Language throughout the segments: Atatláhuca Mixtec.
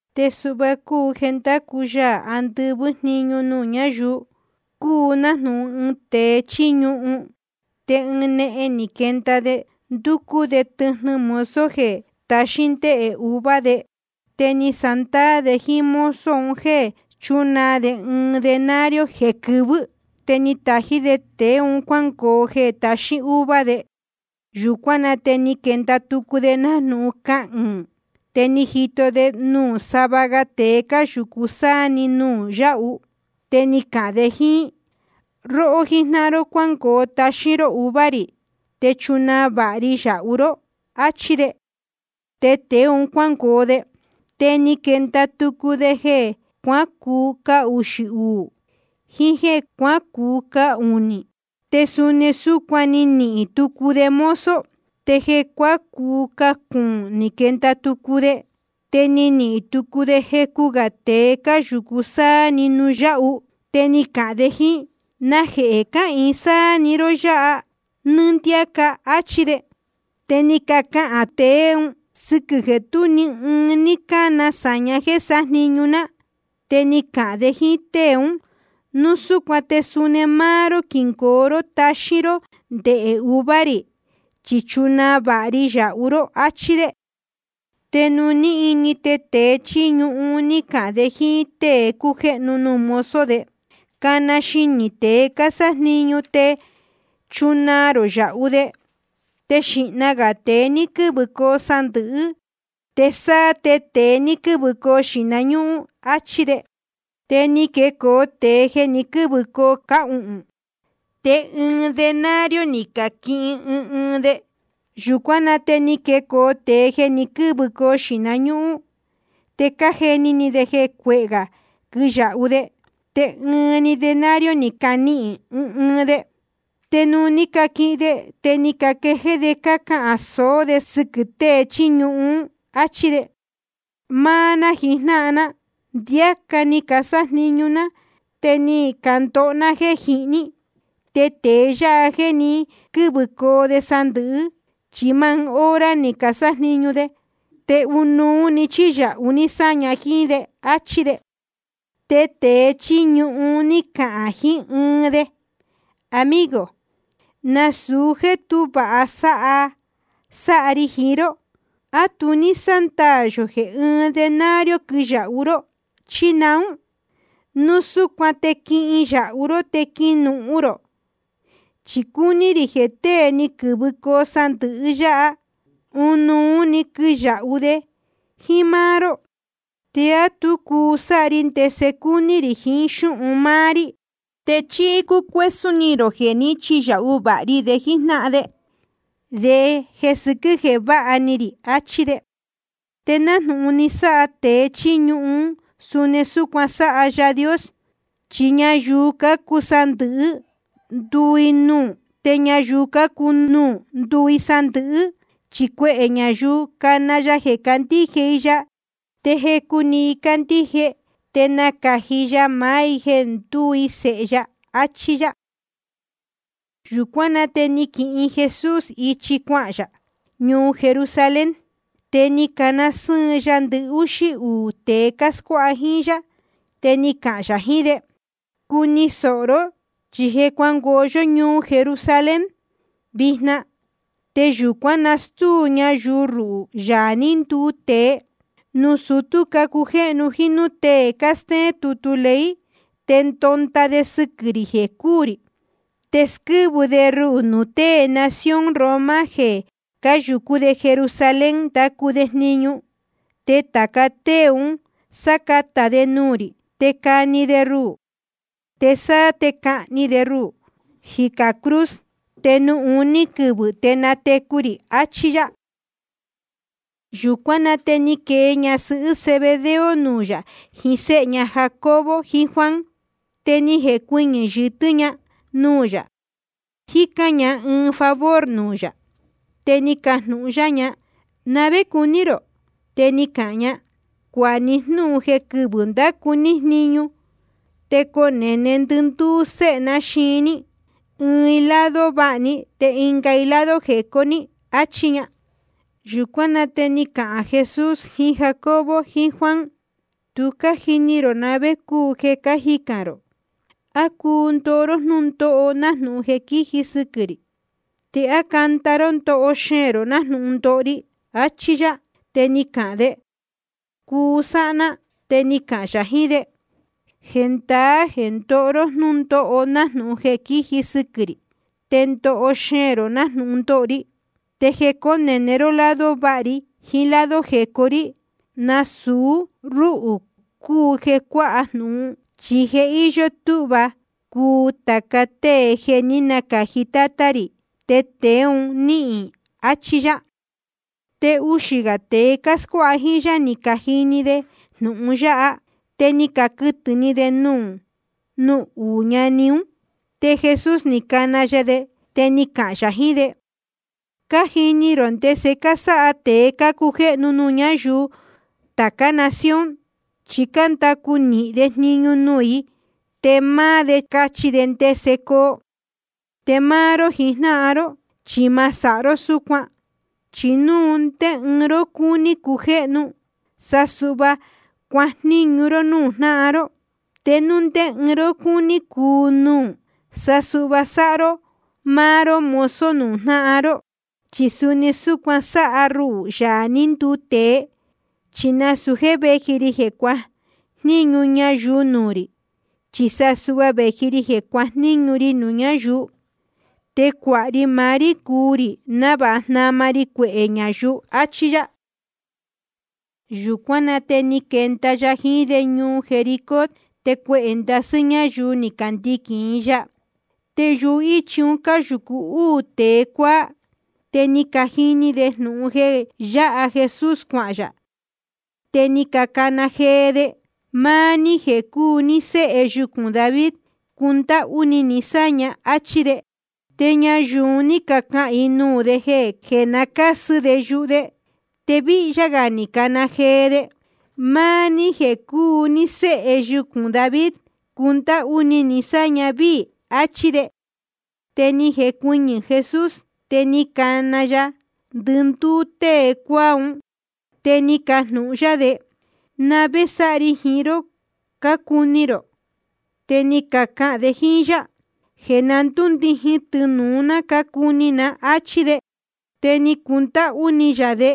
’Te suhva cúu jeē ndácu Yaā andɨvɨ́ jniñu nuū ñáyuu: Cúu nájnūhun ɨɨn tēe chíí ñuhun. Te ɨɨn nehen ni quenda de, ndúcú de tɨjnɨ mozo jeē taxín ndéhē uva de. Te ni sándaā de jíín mozo un jéē chúnaa de ɨɨn denario jeē quɨvɨ́. Te ni tají de tēe un cuángoo jeē taxín uva de. Yūcuán na te ni quenda tucu de nájnūhun cahɨɨ̄n. Te ni jito de nuū sava ga tēe cáyūcu sáá‑ni de nuū yáhu. Te ni cahān de jíín: Róhó jíjnáhan ró, cuángoo taxín ró uva rī, te chunaa vāha ri yāhu ró, áchí de. Te tēe un cuángoo de. Te ni quenda tucu de jeē cuácuu cahuxī uū jiín jéē cuácuu cahunī, te suni súcuan ni nihīn tucu de mozo. Te jeē cuácuu cahuhūn ni quenda tucu de. Te ni nihīn tucu de jecu gā tēe cáyūcu sáá‑ni nuū yáhu. Te ni cahān de jíín: ¿Najehē cáhīin sáá‑ni ró yáha nɨ́ɨ́ ndiáca? áchí de. Te ni cacahān tēe ún: Sɨquɨ̄ jeē tú ni ɨɨn ní cána sāña jéē sájniñu ná. Te ni cahān de jíín tée ún: Núu súcuan te suni máá ró quingoo ró taxín ró ndehē uva rī, chi chunaa vāha ri yāhu ró, áchí de. Te nuū ní ini, te tēe chíí ñuhun ni cahān de jíín tée cújéhnu nuū mozo de: Cana xinī tēe cásájniñu te chunaa rō yāhu de, te xīhna gā tēe ni quɨ̄vɨcoo sandɨ̄hɨ́, te sáá te tēe ni quɨ̄vɨcoo xīhna ñúhún, áchí de. Te ni quecoo tēe jeē ni quɨ́vɨcoo cahuhūn. Te ɨɨn denario ni caquihin ɨɨn ɨɨn de. Yūcuán na te ni quecoo tēe jeē ni quɨ́vɨcoo xīhna ñúhún. Te cájeni ni de jeē cuehē gā quiyāhu de. Te ɨɨn‑ni denario ni caquihin ɨɨn ɨɨn de. Te nuū ní caquihin de, te ni caquejéé de cácahān sōó de sɨquɨ̄ tēe chíí ñuhun, áchí de: Máá ná jijnáhan ná, ndiáca ni casájniñu ná, te ni candoho ná jéē jihní. Te tēe yáha jéē ni quɨ́vɨcoo sandɨ̄hɨ́, chi máá ɨɨn hora‑ni ni casájniñu de. Te ɨnuú‑ni ni chiyāhu ní sáña jíín de, áchí de. Te tēe chíí ñuhun ni cahān jiín ɨɨn de: Amigo, nasūu jéē tú vāha sáha ri jiín ró. ¿A tu ní sándaā yō jeē ɨɨn denario quiyāhu ró, chí naún? Núu súcuan te quihin yāhu ró te quinuhun rō. Chi cúní rī jeē tée ni quɨ̄vɨcoo sandɨ̄hɨ yáha, ɨnuú quiyāhu de jíín máá ró. ¿Te á tu cuu sáha ri ndese cúní rī jiín xúhun máá rí? ¿Te chí cúcuésún ni rō jeē ní chiyāhu vāha ri de jíjnáhan de sɨquɨ̄ jeē váha ni rī? áchí de. Te nájnūhun ni sáha tēe chíí ñuhun, suni súcuan sáha Yaā Dios. Chi ñayuu cácuu sandɨ̄hɨ́, nduu i nuū. Te ñayuu cácuu nuū, nduu i sandɨ̄hɨ́. Chi cuehē ñayuu cána ya jeē candíje i ya. Te jecu‑ni i cándíje, te nácāji ya maá i jeē ndúu i sēhe ya. Achí yá. Yūcuán na te ná ni quihin Jesús ichi cuahān yā ñuu Jerusalén, te ni cana sɨ́ɨn ya ndɨhúxí uū tēe cáscuáha jíín yá. Te ni cahān yā jiín de: Cuni sōho ró, chi je cuángoo yó ñuu Jerusalén vijna, te yūcuán nastúu ñayuu ruhū, Yaā ní nduu tēe, nuū sutú cácujéhnu jíín núū tée cástéén tutu ley. Te ndonda de sɨquɨ̄ rī jeē cúū rī. Te squɨ́vɨ de ruhū nuū tée nación Roma jeē cáyūcú Jerusalén cándacu jniñu. Te tāca tée un sácatā de nuū rī. Te cani de ruhū, te sáá te cahni de ruhū jicā cruz. Te nuū uní quɨvɨ̄ te natecu rī. Achí yá. Yūcuán na te ni quee ñasɨhɨ́ Zebedeo nuū yā jiín séhe ña Jacobo jiín Juan. Te ni jecuɨñɨ̄ yɨtɨ́ ña nuū yā, jícán ña ɨɨn favor nuū yā. Te ni cajnūhun yá ña: ¿Na vé cuní rō? Te ni cahān ña: Cuāha ní jnúhun jeē quɨvɨ̄ ndácu ní jniñu te conēne ndɨndúú séhe ná yáha xiin ní, ɨɨn i lado váha ní, te ɨnga i lado jecó ní, achí ña. Yūcuán na te ni cahān Jesús jiín Jacobo jiín Juan: Tu cájini rō na vé cúu jeē cájicān rō. ¿A cuu ndoho ró jnúndóho nájnūhun jeē quíji sɨquɨ̄ rī? ¿Te á canda ró ndoho xeēn rō nájnūhun ndoho ri? Achí yá. Te ni cacahān de: Cuu sáha ná. Te ni cahān yā jiín de: Jendaá jeē ndoho ró jnúndóho nájnūhun jeē quíji sɨquɨ̄ rī, te ndoho xeēn rō nájnūhun ndoho ri. Te jeē cónēne ró lado váha ri jiín lado jecó rí, nasūu rúhū cúu jeē cuáha jnūhun. Chi je íyó túhva cuu tāca tée jeē ní nacāji Tátá rī, te tēe un níhīn. Achí yá. Te uxī gā tēe cáscuáha jíín yá ní cajini de jnūhun yáha. Te ni caquɨtɨ̄ ni de nuū uú ñani ún. Te Jesús ni cana ya de, te ni cahān yā jiín de: Cájini rō ndese cásáha tēe cácujéhnu nuū ñáyuu tācá nación. Chi cándacu nīhin de jniñu nuū i, te máá de cáchí ndese coo. Te máá ró jijnáhan ró, chi ma sáha ró súcuan. Chi núu ndé ɨɨn ró cúní cujéhnu, sa suhva cuajníñu ró núū jnáhan ró. Te núu ndé ɨɨn ró cúní cuu nuū, sa suhva sáha ró máá ró mozo nuū jnáhan ró. Chi suni súcuan sáha ruhū, Yaā ní nduu tēe, chi nasūu jéē véji ri jeē cuajníñu ñayuu nuū rī, chi sa suhva vēji ri jeē cuajníñu ri nuū ñáyuu. Te cuāha ri maá rí cuu rī návāha jnama ri cuehē ñayuu, achí yá. Yūcuán na te ni quenda ya jiín de ñuu Jericó. Te cuehē ndasɨ́ ñáyuu ni candiquīn i ya. Te yuhíchi un cáyūcu úū tēe cuáá. Te ni cajini de jnūhun jeē yáha Jesús cuahān yā, te ni cacana jee de: Máá ní jeē cúu ní Séhe yucūn David, cundáhú ni ni sáña, áchí de. Te ñayuu un ní cacahān i nuū de jeē na cásɨ de yuhu de. Te víhyá gā ni cacana jee de: Máá ní jeē cúu ní Séhe yucūn David, cundáhú ni ni sáña víī, achí de. Te ni jecuɨñɨ̄ Jesús, te ni cana ya ndɨndúú tée cuáá un, te ni cajnūhun yá de: ¿Na vé sáha ri jiín ró cácuni rō? Te ni cacahān de jíín yá: Jeē na ndúndijin tɨnūu ná cácuni ná, áchí de. Te ni cundáhú ni yā de.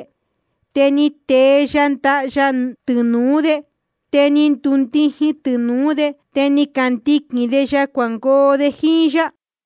Te ni tee ya ndaha ya tɨnūú de. Te ni candundijin‑ni tɨnūú de. Te ni candiquīn de ya cuangoo de jíín yá.